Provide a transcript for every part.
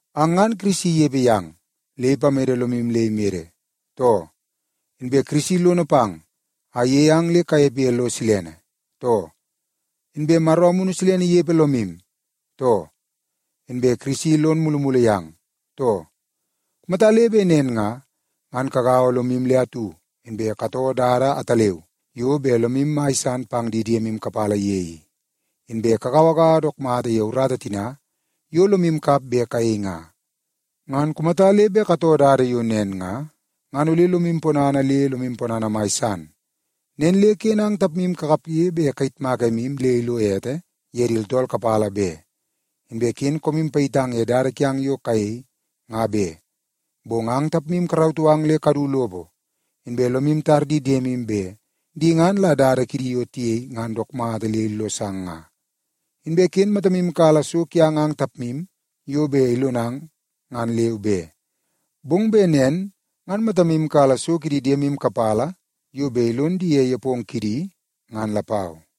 Ang ngan Kirisi inepe yang le ipamede lomu le imede, too? Inbe Kirisi lono pang a iyei ang le kanepe ye lo silene, too? Inbe Maro Amunu Silene inepe lomu, too? Inbe Kirisi lon mulumulu yang, too? Kumata le bet nen nga, ngan kagaua lomu le atu, inbe katoo dada ataleu yo bet lomu mai san pang di diemu kapala ye i, inbe kagauagaua dook mata ye urata tina yo lomu kap bet kayei nga. Ngan kumata le bet katoo dada yo nen nga, ngan ole lok ponana le lok ponana mai san. Nen le ken ang tapmu kakapge bet kayitmak emu le ilo ete ye di tooltool kapala be. Inbe ken koomu payitang ye dada kiang yo kayei, nga be. Bong ang tapmu karautoo ang le kadu lopo, inbe lomu tar di diemu bet di ngan la dada kidi yo tiyei ngan dook mata le illosang nga. Inbe ken matamu kala so kiang ang tapmu yo bet ilonang ngan leu be, bong bet nen ngan matamu kala so kidi diemu kapala yo bet ilon di ye nepongo kidi, ngan lapau.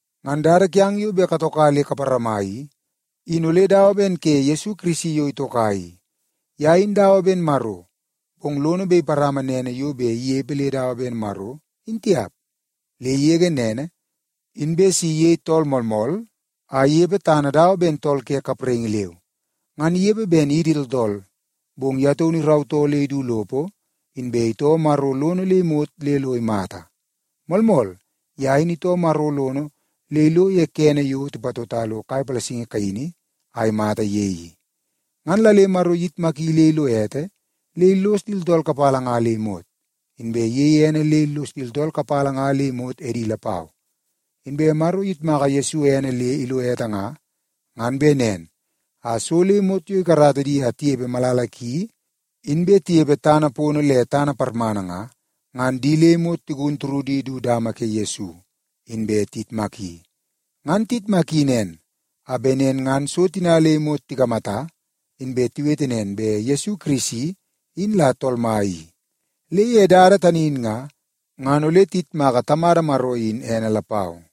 Ngan dada kiang yo bet katoka le kaparama i, in ole dawa ben ke Yesu Kirisi yo itoka i. Ye in dawa ben Maro, bong lono bet iparama nene yo bet inepe le dawa ben Maro, in tiap. Le igege nene, inbe si iyei tool moolmool a inepe tana dawa ben tool ke kapraingi leu. Ngan inepe ben idi tooltool, bong ye taunu irautoo le idu lopo, inbe itoo Maro lono le imot le lo imata. Moolmool, ye in itoo Maro lono le ilo ye kene yo tipatota lo kai palasingi kaini a imata ye i. Ngan la le Maro iyitmaki le ilo ete le illos di tooltool kapala nga le imot, inbe iyeie ene le illos di tooltool kapala nga le imot edi lapau. Inbe Maro iyitmaka Yesu ene le ilo ete nga, ngan bet nen a so le imot yo ikarata di a tinepe malala ki, inbe tinepe tana pono le tana parmana nga, ngan di le imot tigun turudi du dama ke Yesu inbe tiyitmaki. Ngan iyitmaki nen, a bet nen ngan so tina le imot tikamata, inbe tiwete nen bet Yesu Kirisi in la Tool Mai i. Le ye dada tani in nga, ngan ole tiyitmaka Tamada Maro in ene lapau.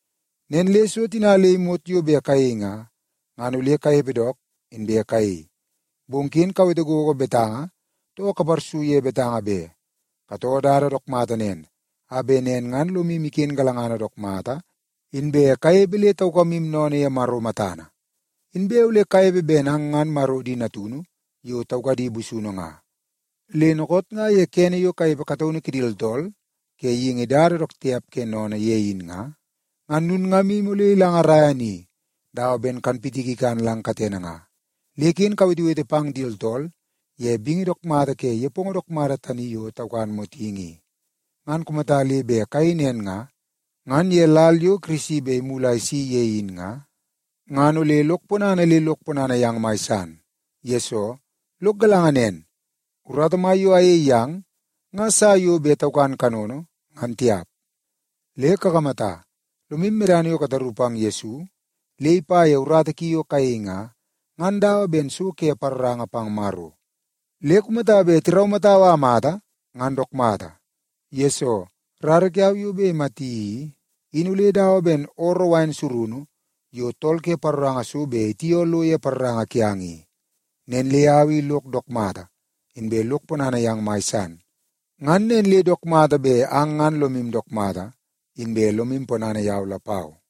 Nen le so tina le imot yo bet kayei nga, ngan ole kanepe dook, inbe kayei. Bong ken kawete gogo betanga, too kaparsu ye betanga be. Katoo dada dook mata nen, a bet nen ngan lomu iken galangana dook mata, inbe kanepe le taukamu sennene ye Maro matana. Inbe ole kanepe ben ang ngan Maro di natunu yo taukadi busunu nga. Le dookoot nga ye kene yo kanepe kataunu kidi tooltool ke geingi dada dook tiap ke sennene ye in nga, ngan lulngamu ole ilangaraia ni dawa ben kanpitiki ikan lang katene nga. Le ken kawetewete pang di tooltool ye bingi dook mata ke nepongo dook mata tani yo taukan motingi i. Ngan kumata le bet kayei nen nga, ngan ye lal yo Kirisi bet imulu a isi ye in nga, ngan ole lok ponana le lok ponana yang mai san. Yesoo, lok galanga nen, urata mai yo ayei yang nga sa yo bet taukan kanono, ngan tiap. Le kakamata, lomu medana yo kataru pang Yesu le ipa ye urata ki yo kayei nga, ngan dawa ben so ke paroranga pang Maro. Le kumata bet tiraumatau a amata, ngan dook mata, yesoo rara kiau yo bet imati i, in ole dawa ben ooroo wain surunu yo tool ke paroranga so bet itioo lo ye paroranga kiang i. Nen le au i lok dook mata, inbe lok ponana yang mai san. Ngan nen le dook mata bet ang ngan lomu dook mata, inbe lomu ponana yau lapau.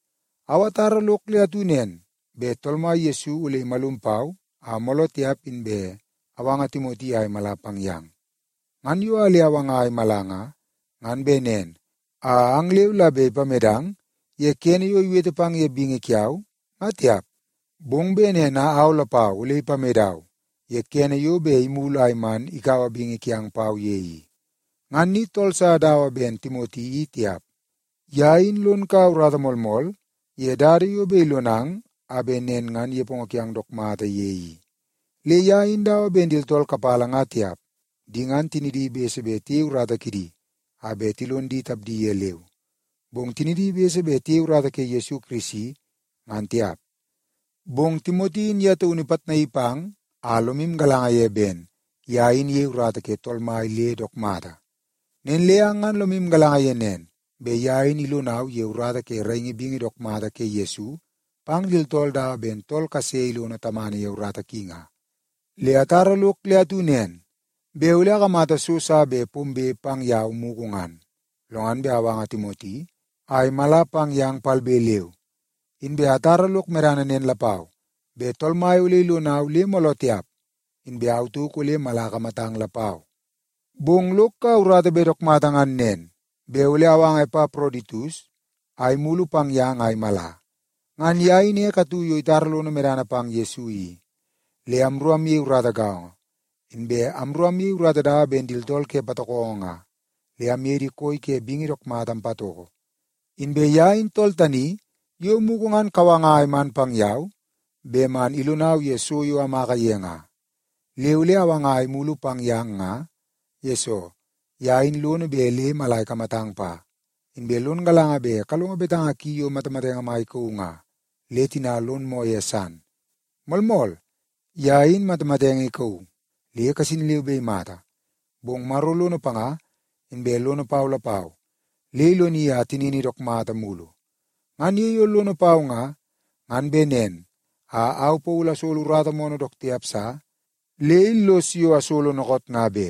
Au atara lok le atu nen, bet Tool Mai Yesu ole imalum pau a mooloo tiap, inbe awanga Timoti a imala pang yang. Ngan yo a le awanga a imala nga, ngan bet nen a ang leu la bet ipamedang ye kene yo iwete pang ye bingi kiau, nga tiap, bong bet nen a au lapau ole ipamedau ye kene yo bet imulu a iman ikaua bingi kiang pau ye i. Ngan ni tool sa dawa ben Timoti i tiap. Ye in lon kaua urata moolmool ye dada yo bet ilonang a bet nen ngan nepongo kiang dook mata ye i. Le ye in dawa ben di tooltool kapala nga tiap. Di ngan tinidi bese bet tiyei urata kidi a bet tilon di tapdi ye leu, bong tinidi bese bet tiyei urata ke Yesu Kirisi, ngan tiap. Bong Timoti in ye taunu ipitnaii pang a lomu galanga ye ben ye in iyei urata ke Tool Mai le dook mata. Nen le ang ngan lomu galanga ye nen, bet ye in ilonau ye urata ke raingi bingi dook mata ke Yesu pang di tooltool dawa ben tool kase ilono tamana ye urata ki nga. Le atara lok le atu nen, bet ole akamata so sa bet pombe pang yau mugu ngan, lo ngan bet awanga Timoti a imala pang yang palbe leu. Inbe atara lok medana nen lapau, bet Tool Mai ole ilonau le mooloo tiap, inbe au tauk ole mala akamatang lapau. Bong lok kaua urata bet dook mata ngan nen, bet ole awanga Epaproditus a imulu pang yang a imala. Ngan ye in ek atu yo itara lono medana pang Yesu i, le amru amyei urata gaongo, inbe amru amyei urata dawa ben di tooltool ke patokongo nga le amye di koi ke bingi dook mata ampatoko. Inbe ye in tool tani yo mugu ngan kawanga a iman pang yau bet man ilonau ye so yo amaka ye nga. Le ole awanga a imulu pang yang nga, yesoo ye in lono bet le mala ikamatang pa. Inbe lon galanga bet kalongo betanga ki yo matamatenge mai ikauu nga, le tina lon moo ye san. Moolmool, ye in matamatenge ikauu le kasin leu be imata. Bong Maro lono panga inbe lono pau lapau, le iloni a tinini dook mata mulu. Ngan ye yo lono pau nga, ngan bet nen a au Paulu asolo urata moonoo dook tiap sa le illos yo asolo dookoot nga be.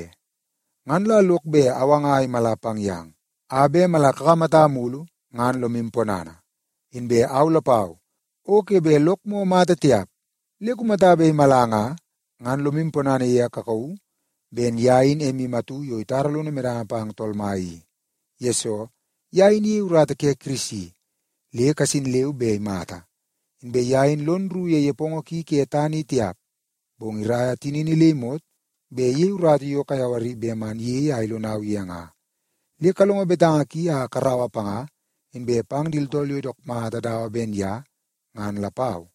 Ngan la lok bet awanga a imala pang yang, a bet mala kakamata mulu, ngan lomu ponana. Inbe au lapau o ke bet lok moo mata tiap. Le kumata bet imala nga, ngan lomu ponana ye a kakauu ben ye in emu atu yo itara lono medana pang Tool Mai i. Yesoo, ye in iyei urata ke Kirisi, le kasin leu be imata. Inbe ye in lon rru ye nepongo ki ke tana i tiap, bong iraia tinini le imot bet iyei urata yo kayawari bet man iyei a ilonau ye nga. Le kalongo betanga ki a karaua panga, inbe pang di tooltool yo dook mata dawa ben ye ngan lapau.